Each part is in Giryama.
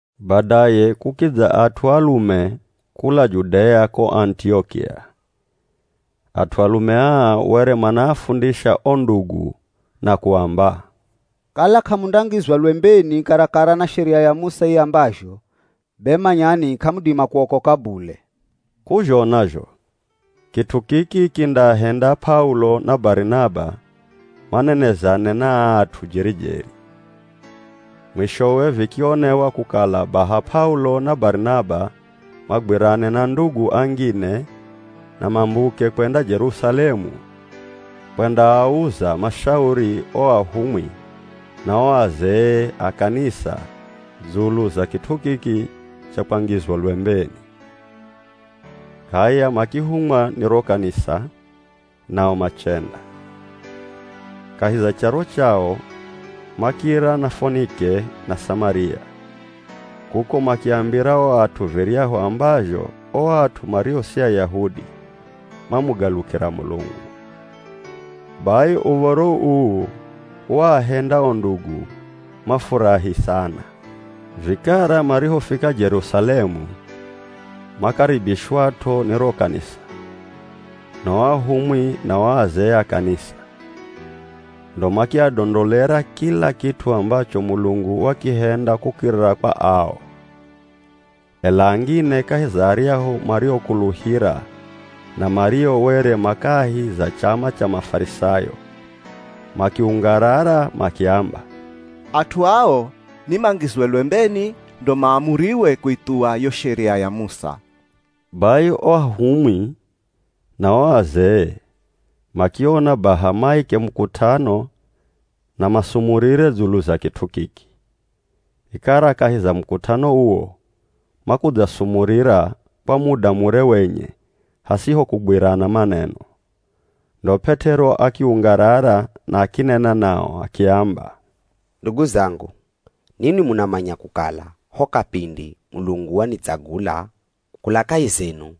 Badaye kukidza at'u alume kula Judea ko Anitiokia. At'u alume aa were manaafundisha o ndugu na kuamba, “Kala k'amundangizwa lwembeni karakara na Sheria ya Musa iambazho, be manyani k'amudima kuokoka bule.” K'uzhona zho kit'u kiki kindaahenda P'aulo na Barinaba manenezane na aa at'u jeri-jeri. Mwishowe vikionewa kukala baha P'aulo na Barinaba magwirane na ndugu angine na mambuke kwenda Jerusalemu kwendaauza mashauri o ahumwi na o azee a kanisa dzulu za kit'u kiki cha kwangizwa lwembeni. H'aya makihumwa ni ro kanisa, nao machenda. Kahi za charo chao, makira na Fonike na Samaria, kuko makiambira o at'u viryahu ambazho o at'u mario si Ayahudi mamugalukira Mulungu. Bai uv̱oro uu waahenda o ndugu mafurahi sana. Vikara marihofika Jerusalemu, makaribishwat'o ni ro kanisa, na o ahumwi na o azee a kanisa. Ndo makiadondolera kila kit'u ambacho Mulungu wakihenda kukirira kwa ao. Ela angine kahi za aryahu mariokuluhira na mario were ma kahi za chama cha Mafarisayo makiungarara makiamba, “At'u ao ni mangizwe lwembeni ndo maamuriwe kuithuwa yo Sheria ya Musa.” Bai o ahumwi na o azee makiona baha maike mukut'ano na masumurire dzulu za kit'u kiki. Vikara kahi za mukut'ano uwo makudzasumurira kwa muda mure wenye hasiho kugwirana maneno, ndo P'et'ero akiungarara na akinena nao akiamba, “Ndugu zangu, ninwi munamanya kukala ho kapindi Mulungu wanitsagula kula kahi zenu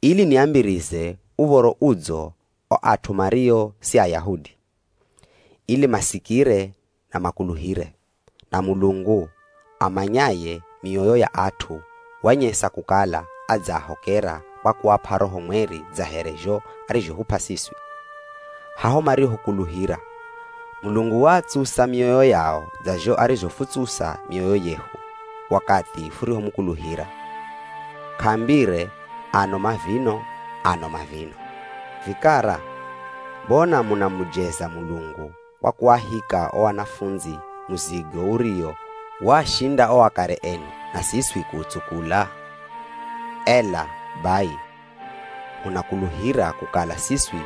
ili niambirize Uv̱oro Udzo o at'u mario si Ayahudi, ili masikire na makuluhire. Na Mulungu amanyaye mioyo ya at'u, wanyesa kukala adzaahokera kwa kuap'a Roho Mweri dza here zho arizhohup'a siswi. Haho marihokuluhira, Mulungu waatsusa mioyo yao dza zho arizhofutsusa mioyo yehu wakathi furihomukuluhira. K'aambire ano mavino ano mavino. Vikara, mbona munamujeza Mulungu kwa kuahika o anafundzi muzigo uriwo waashinda o akare enu na siswi kuutsukula? Ela bai, hunakuluhira kukala siswi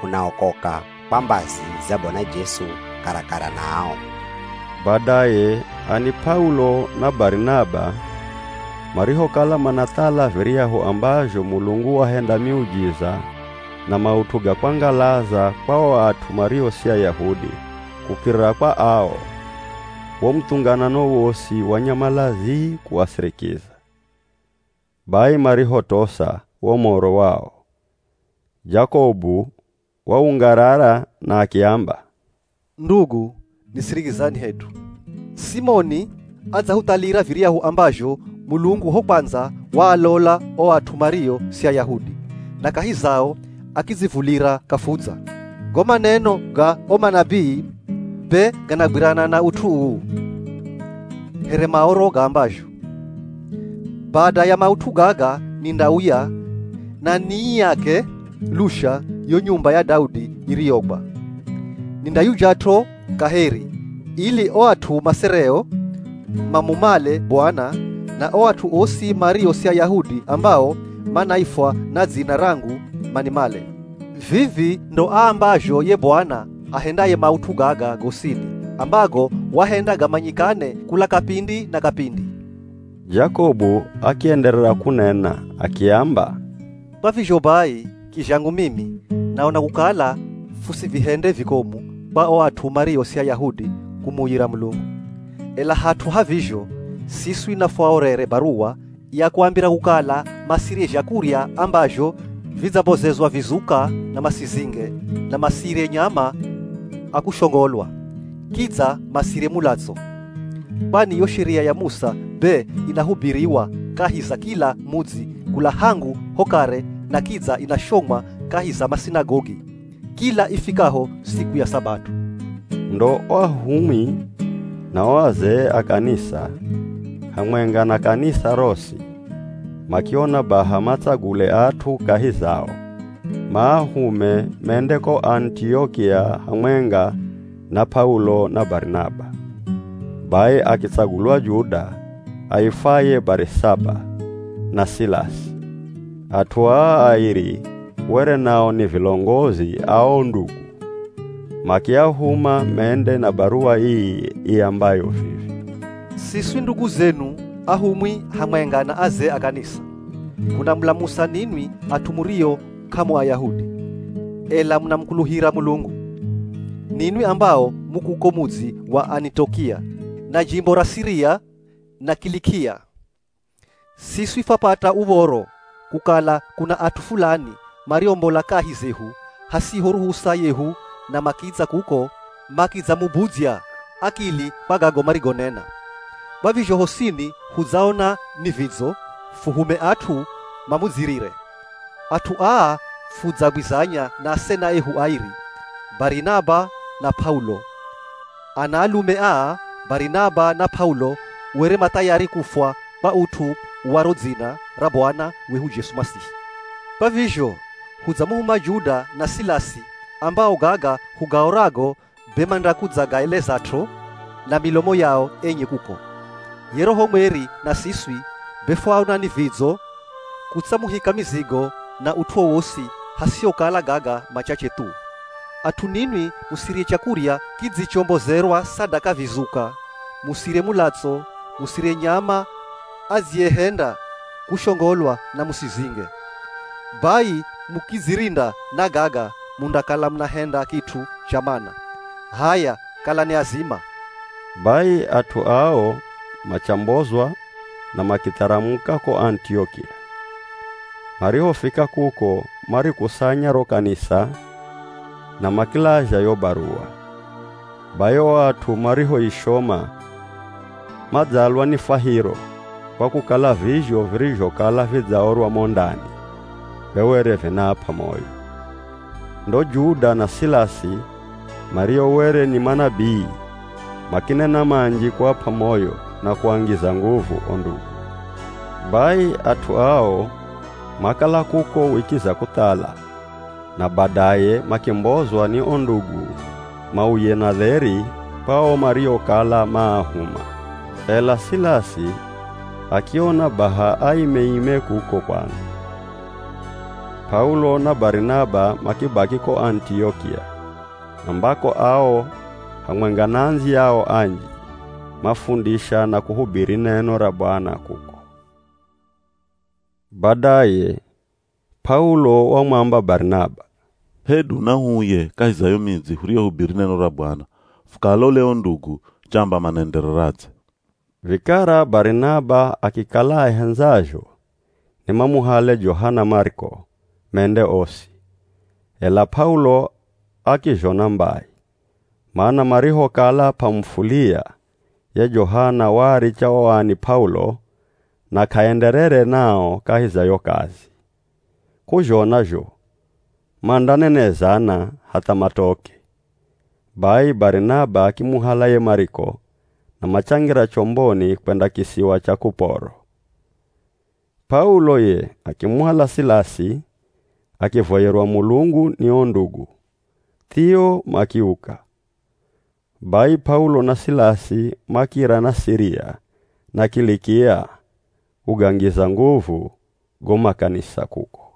hunaokoka kwa mbazi za Bwana Jesu, karakara na ao.” Badaye ani P'aulo na Barinaba marihokala manathala viryahu ambazho Mulungu wahenda miujiza na maut'u ga kwangalaza kwa o at'u mario si Ayahudi kukirira kwa ao, wo muthunganano wosi wanyamala zii kuasirikiza. Bai marihotosa wo moro wao, Jakobu waungarara na akiamba, “Ndugu, nisirikizani hedu. Simoni adzahuthalira viryahu ambazho Mulungu ho kwandza waalola o at'u mario si Ayahudi, na kahi zao akidzivulira kafudza. Go maneno ga o manabii be ganagwirana na ut'u uu. Here Maoro gaambazho, ‘Bada ya maut'u gaga nindauya na niiake lusha yo nyumba ya Daudi iriyogwa. Nindayujat'o kaheri, ili o at'u masereo mamumale Bwana; na o at'u osi mario si Ayahudi ambao manaifwa na dzina rangu manimale. Vivi ndo aambazho ye Bwana ahendaye maut'u gaga gosini, ambago wahenda gamanyikane kula kapindi na kapindi.’” Jakobu akienderera kunena akiamba, “Kwa vizho bai, kizhangu mimi, naona kukala fusivihende vikomu kwa o at'u mario si Ayahudi kumuuyira Mulungu, ela hat'u ha vizho, siswi nafuaorere baruwa ya kuambira kukala masirye zhakurya ambazho vidzambozezwa vizuka na masizinge, na masirye nyama a kushongolwa, kidza masirye mulatso. Kwani yo Sheria ya Musa be inahubiriwa kahi za kila mudzi kula hangu ho kare na kidza inashomwa kahi za masinagogi kila ifikaho siku ya Sabato.” Ndo o ahumwi na o azee a kanisa, hamwenga na kanisa rosi makiona baha matsagule at'u kahi zao, maahume mende ko Anitiokia hamwenga na P'aulo na Barinaba. Bai akitsagulwa Juda, aifwaye Barisaba na Silasi. At'u aa airi were nao ni vilongozi a o ndugu. Makiahuma mende na baruwa ii iambayo vivi: “Siswi ndugu zenu ahumwi hamwenga na azee a kanisa, hunamulamusa ninwi at'u murio k'amu Ayahudi, ela munamukuluhira Mulungu. Ninwi ambao mu kuko mudzi wa Anitiokia, na jimbo ra Siria, na Kilikia. Siswi fwapata uv̱oro kukala kuna at'u fulani mariombola kahi zehu hasiho ruhusa yehu na makidza kuko makidzamubudzya akili kwa gago marigonena. Kwa vizho hosini hudzaona ni vidzo, fuhume at'u mamudzirire. At'u aa fudzaagwizanya na asena ehu airi, Barinaba na P'aulo. Anaalume aa, Barinaba na P'aulo were ma thayari kufwa kwa ut'u wa ro dzina ra Bwana wehu Jesu Masihi. Kwa vizho hudzamuhuma Juda na Silasi ambao gaga hugaorago, be mandakudzagaelezat'o na milomo yao enye kuko. Ye Roho Mweri na siswi, be fwaona ni vidzo kutsamuhika mizigo na ut'u wowosi hasihokala gaga machache thu. At'u ninwi musirye chakurya kidzichombozerwa sadaka vizuka, musirye mulatso, musirye nyama adziyehenda kushongolwa na musizinge. Bai mukidzirinda na gaga mundakala munahenda kit'u cha mana. H'aya kalani azima.” Bai at'u ao machambozwa na makitharamuka ko Anitiokia. Marihofika kuko marikusanya ro kanisa na makilazha yo baruwa. Bai o at'u marihoishoma madzalwa ni fwahiro kwa kukala vizho virizhokala vidzaorwa mo ndani be were vinaap'a moyo. Ndo Juda na Silasi, mario were ni manabii, makinena manji kuap'a moyo na kuangiza nguvu o ndugu. Bai at'u ao makala kuko wiki za kuthala na badaye makimbozwa ni o ndugu mauye na dheri kwa ao mariokala maahuma. [ Ela Silasi akiona baha aimeime kuko kwandza.] P'aulo na Barinaba makibaki ko Anitiokia, ambako ao hamwenga na andziyao anji mafundisha na kuhubiri neno ra Bwana kuko. Badaye P'aulo wamwamba Barinaba, “Hedu nahuuye kahi za yo midzi huriyohubiri neno ra Bwana, fukaalole o ndugu chamba manaendereradze.” Vikara Barinaba akikala ahendzazho ni mamuhale Johana Mariko, mende osi, ela P'aulo akizhona mbai, mana marihokala P'amufulia ye Johana waaricha o ani P'aulo na k'aenderere nao kahi za yo kazi. K'uzhona zho mandanenezana hatha matoke. Bai Barinaba akimuhala ye Mariko na machangira chomboni kwenda kisiwa cha Kuporo. P'aulo ye akimuhala Silasi akivoyerwa Mulungu ni o ndugu, thio, makiuka. Bai P'aulo na Silasi makira na Siria na Kilikia kugangiza nguvu go makanisa kuko.